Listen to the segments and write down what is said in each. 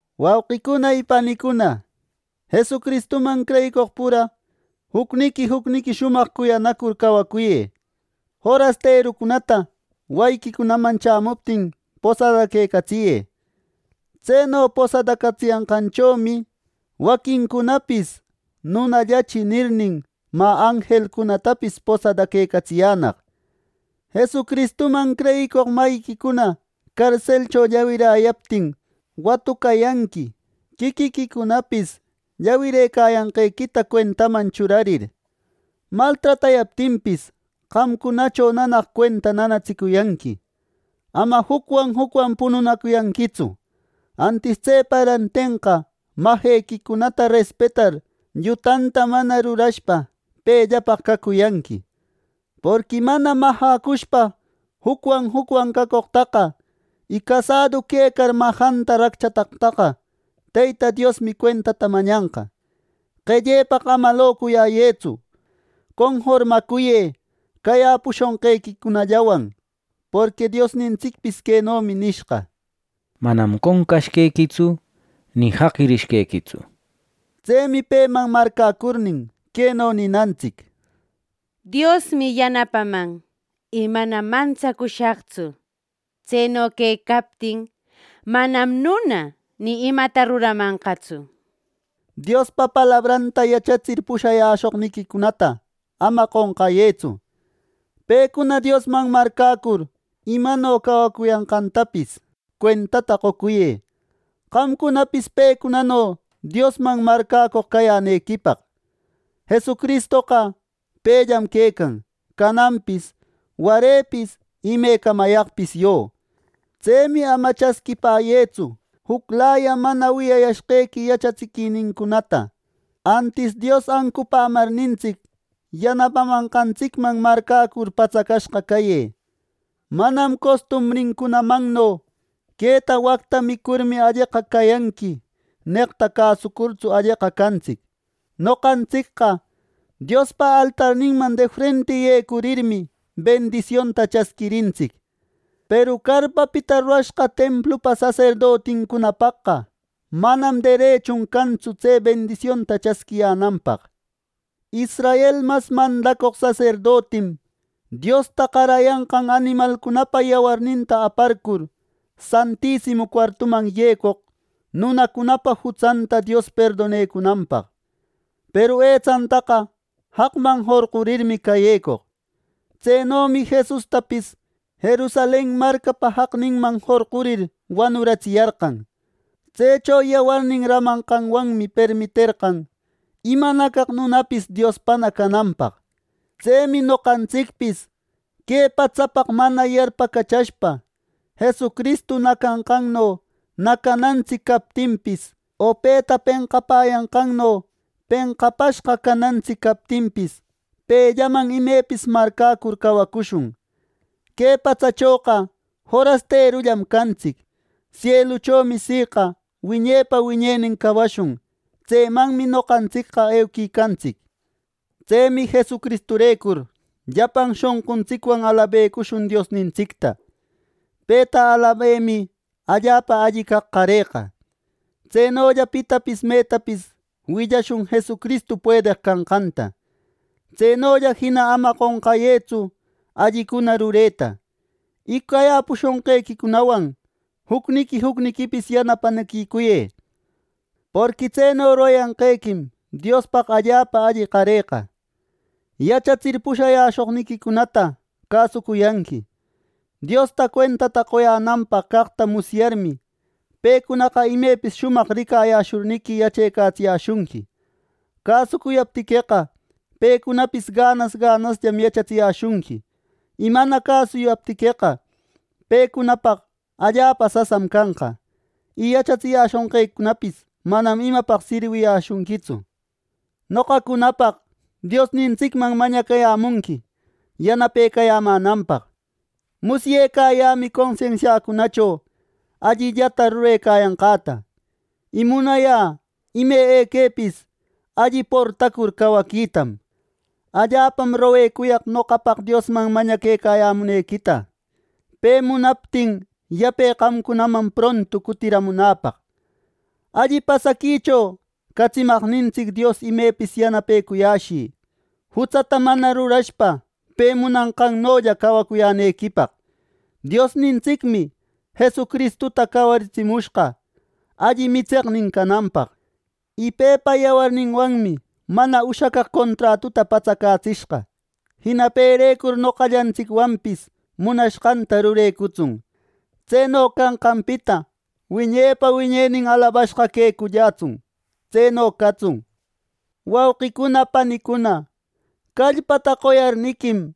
Wauqicuna y panicuna, Jesucristuman creyicoq pura jucniqui jucniqui shumaq cuyanacur cawacuyë. Forasterucunata wayiquicunaman chämuptin, posadaquecatsiyë. Tseno posadacatsiyanqanchomi waquincunapis “Nunallachi” nirnin, mä anjelcunatapis posadaquecatsiyänaq. Jesucristuman creyicoq mayiquicuna carselcho llawiräyaptin, watucayanqui quiquiquicunapis llawirëcayanqequita cuentaman churarir. Maltratayaptinpis, qamcunacho nanaq cuenta nanatsicuyanqui. Ama jucwan jucwan pununacuyanquitsu. Antis tsepa rantenqa majequicunata respetar llutanta mana rurashpa pellapaq cacuyanqui, porqui mana majäcushpa jucwan jucwan cacoqtaqa, y casadu quecar majanta racchataqtaqa Teyta Diosmi cuentata mañanqa. Qellepaq ama locuyäyëtsu. Conformacuyë cayäpushonqequicunallawan, porqui Diosnintsicpis quenomi nishqa: “Manam qonqashqequitsu ni jaqirishqequitsu” nir. Tsemi peman marcäcurnin queno ninantsic: “Diosmi yanapaman y manam mantsacushaqtsu. Tseno quecaptin ¡manam nuna ni imata ruramanqatsu!” nir. Diospa palabranta yachatsir pushayäshoqniquicunata ama qonqayëtsu. Pecuna Diosman marcäcur imano cawacuyanqantapis cuentata qocuyë, qamcunapis pecunano Diosman marcäcoq cayänequipaq. ¡Jesucristoqa pellam quecan cananpis, warepis y imecamayaqpis yo! Tsemi ama chasquipäyëtsu juclaya mana wiyayashqequi yachatsiquinincunata. Antis Dios ancupämarnintsic, yanapamanqantsicman marcäcur patsacashqa cayë. Manam costumbrincunamanno “Queta wacta micurmi, alleqa cayanqui” neqta, cäsucurtsu alleqa cantsic. Noqantsicqa Diospa altarninman de frenti yecurirmi, bendisionta chasquirintsic, peru carpapita rurashqa templupa saserdotincunapaqa manam derechun cantsu tse bendisionta chasquiyänanpaq. Israel mas mandacoq saserdotim Diosta qarayanqan animalcunapa yawarninta aparcur, Santisimu cuartuman yecoq nunacunapa jutsanta Dios perdonecunanpaq; peru etsantaqa jaqman jorqurirmi cayecoq. Tsenomi Jesustapis Jerusalen marcapa jaqninman jorqurir wanuratsiyarqan. Tsecho yawarnin ramanqanwanmi permiterqan imanacaq nunapis Diospana cananpaq. Tsemi noqantsicpis que patsapaq mana yarpacachashpa, Jesucristu nacanqanno nacanantsic captinpis, o peta penqapäyanqanno penqapashqa canantsic captinpis, pellaman imepis marcäcur cawacushun. Que patsachoqa forasterullam cantsic, sieluchomi siqa wiñepa wiñenin cawashun. Tsemanmi noqantsicqa euquicantsic. Tsemi Jesucristurecur llapan shonquntsicwan alabecushun Diosnintsicta. Peta alabemi allapa alli caq qareqa. Tsenolla pitapis metapis willashun Jesucristu puedeq canqanta. Tsenolla jina ama qonqayëtsu allicuna rureta, y cayäpushonqequicunawan jucniqui jucniquipis yanapanaquicuyë; porqui tseno rurayanqequim Diospaq allapa alli qareqa. Yachatsir pushayäshoniquicunata cäsucuyanqui. Diosta cuentata qoyänanpaq caqta musyarmi, pecunaqa imepis shumaq ricayäshurniqui yachecatsiyäshunqui. Cäsucuyaptiqueqa pecunapis ganas ganasllam yachatsiyäshunqui; y mana cäsuyaptiqueqa, pecunapaq allapa sasam canqa; y yachatsiyäshunqequipis manam imapaq sirwiyäshunquitsu. Noqacunapaq Diosnintsicman mañacayämunqui yanapecayämänanpaq. Musyecayämi consensiacunacho allillata rurecayanqäta, y munayä ime equepis alli portacur cawaquitam. Allapam roguecuyaq noqapaq Diosman mañaquecayämunequita pe munaptin yape qamcunaman prontu cutiramunäpaq. Alli pasaquicho catsimaqnintsic Dios imepis yanapecuyäshï jutsata mana rurashpa pe munanqannolla cawacuyänequipaq. Diosnintsicmi Jesucristuta cawaritsimushqa alli mitseqnintsic cananpaq; y pepa yawarninwanmi mana ushacaq contratuta patsacatsishqa. Jina perecur noqallantsicwanpis munashqanta rurecutsun. ¡Tseno canqanpita wiñepa wiñenin alabashqa quecullätsun! ¡Tseno catsun! Wawqicuna panicuna, callpata qoyarniquim,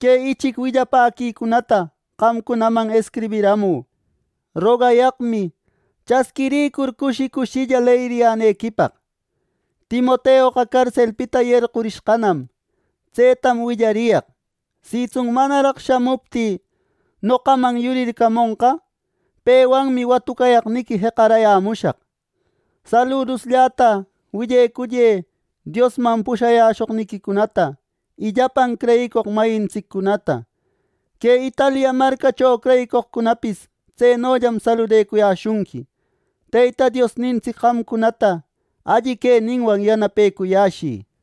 que ichic willapäquicunata qamcunaman escribiramü. Rogayaqmi chasquiricur cushi cushilla leyiriyänequipaq. Timoteoqa carselpita yarqurishqanam. Tsetam willariyaq. Sitsun manaraq shamuptï, noqaman yurircamonqa; pewanmi watucayaqniqui jeqarayämushaq. Saluduslläta willecuyë Diosman pushayäshoqniquicunata y llapan creyicoq mayintsiccunata. Que Italia marcacho creyicoqcunapis tsenollam saludecuyäshunqui. Teyta Diosnintsic qamcunata alli queninwan yanapecuyäshï.